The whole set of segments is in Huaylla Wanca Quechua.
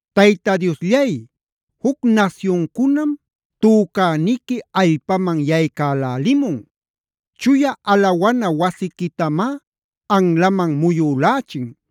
Tayta Diosllay, juc nasyuncunam tücäniqui allpaman yaycälälimun. Chuya alawana wasiquitamá anlaman muyülächin.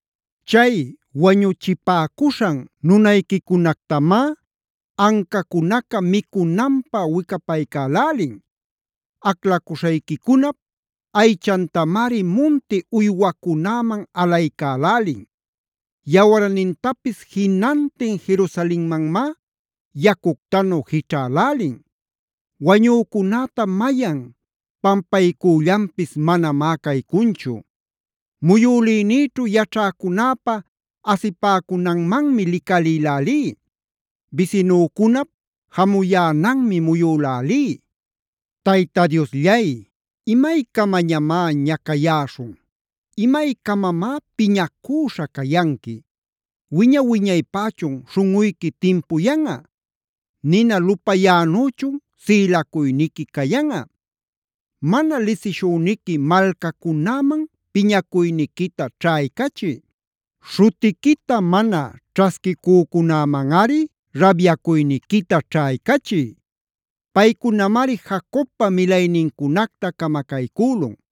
¡Chay wañuchipäcuśhan nunayquicunactamá ancacunäca micunanpä wicapaycälälin! ¡Aclacuśhayquicunap aychantamari munti uywacunäman alaycälälin! Yawarnintapis jinantin Jerusalenmanmá yacuctanu jićhälälin. Wañücunäta mayan pampaycüllanpis manamá caycunchu. Muyülïnïćhu yaćhäcunäpa asipäcunanmanmi licalïlälí. Bisinücunap jamuyänanmi muyülälí. Tayta Diosllay, ¿imaycamamá ñacayäśhun? ¿imaycamamá piñacüśha cayanqui? ¿Wiña-wiñaypächun śhunꞌuyqui timpuyanꞌa? ¿Nina lupayänüchun sïlacuyniqui cayanꞌa? Mana lisishüniqui malcacunäman piñacuyniquita ćhaycachiy. Śhutiquita mana ćhasquicücunämanꞌari rabyacuyniquita ćhaycachiy. Paycunamari Jacobpa milaynincunacta camacaycülun.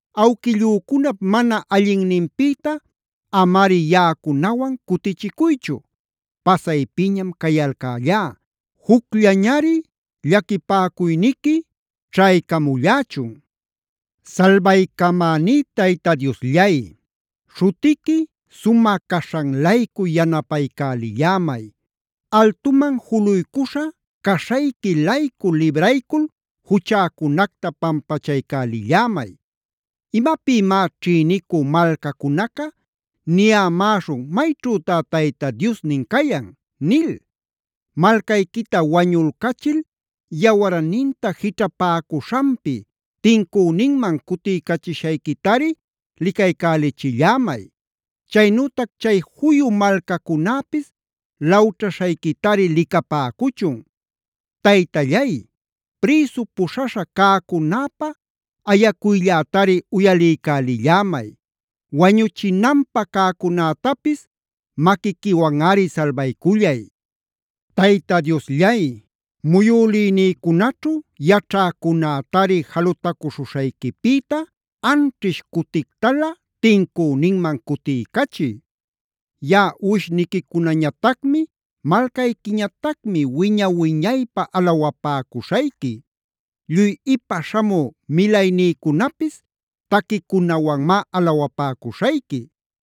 Awquillücunap mana allinninpïta amari yaꞌacunawan cutichicuychu. Pasaypiñam cayalcällá, jucllañari llaquipäcuyniqui ćhaycamullächun. Salbaycamäní Tayta Diosllay, śhutiqui sumä caśhan-laycu yanapaycalillämay. Altuman juluycuśha caśhayqui-laycu libraycul juchäcunacta pampachaycälillämay. ¿Imapïmá ćhïnicü malcacunaca niyämäśhun “¿Mayćhütá Tayta Diosnin cayan?” nil?c Malcayquita wañulcachil yawarninta jićhapäcuśhanpi, tincüninman cutiycachishayquitari licaycälichillämay. Chaynütac chay juyu malcacunäpis lawćhaśhayquitari licapäcuchun. Taytallay, prïsu puśhaśha cäcunäpä ayacuyllätari uyaliycälillämay. Wañuchinanpä cäcunätapis maquiquiwanꞌari salbaycullay. Tayta Diosllay, muyülïnïcunaćhu yaćhäcunätari jalutacuśhuśhayquipïta anćhish cutictalä tincüninman cutiycachiy. Yaꞌa uwishniquicunañatacmi, malcayquiñatacmi wiña-wiñaypä alawapäcuśhayqui. Lluy ipa śhamü milaynïcunapis taquicunawanmá alawapäcuśhayqui.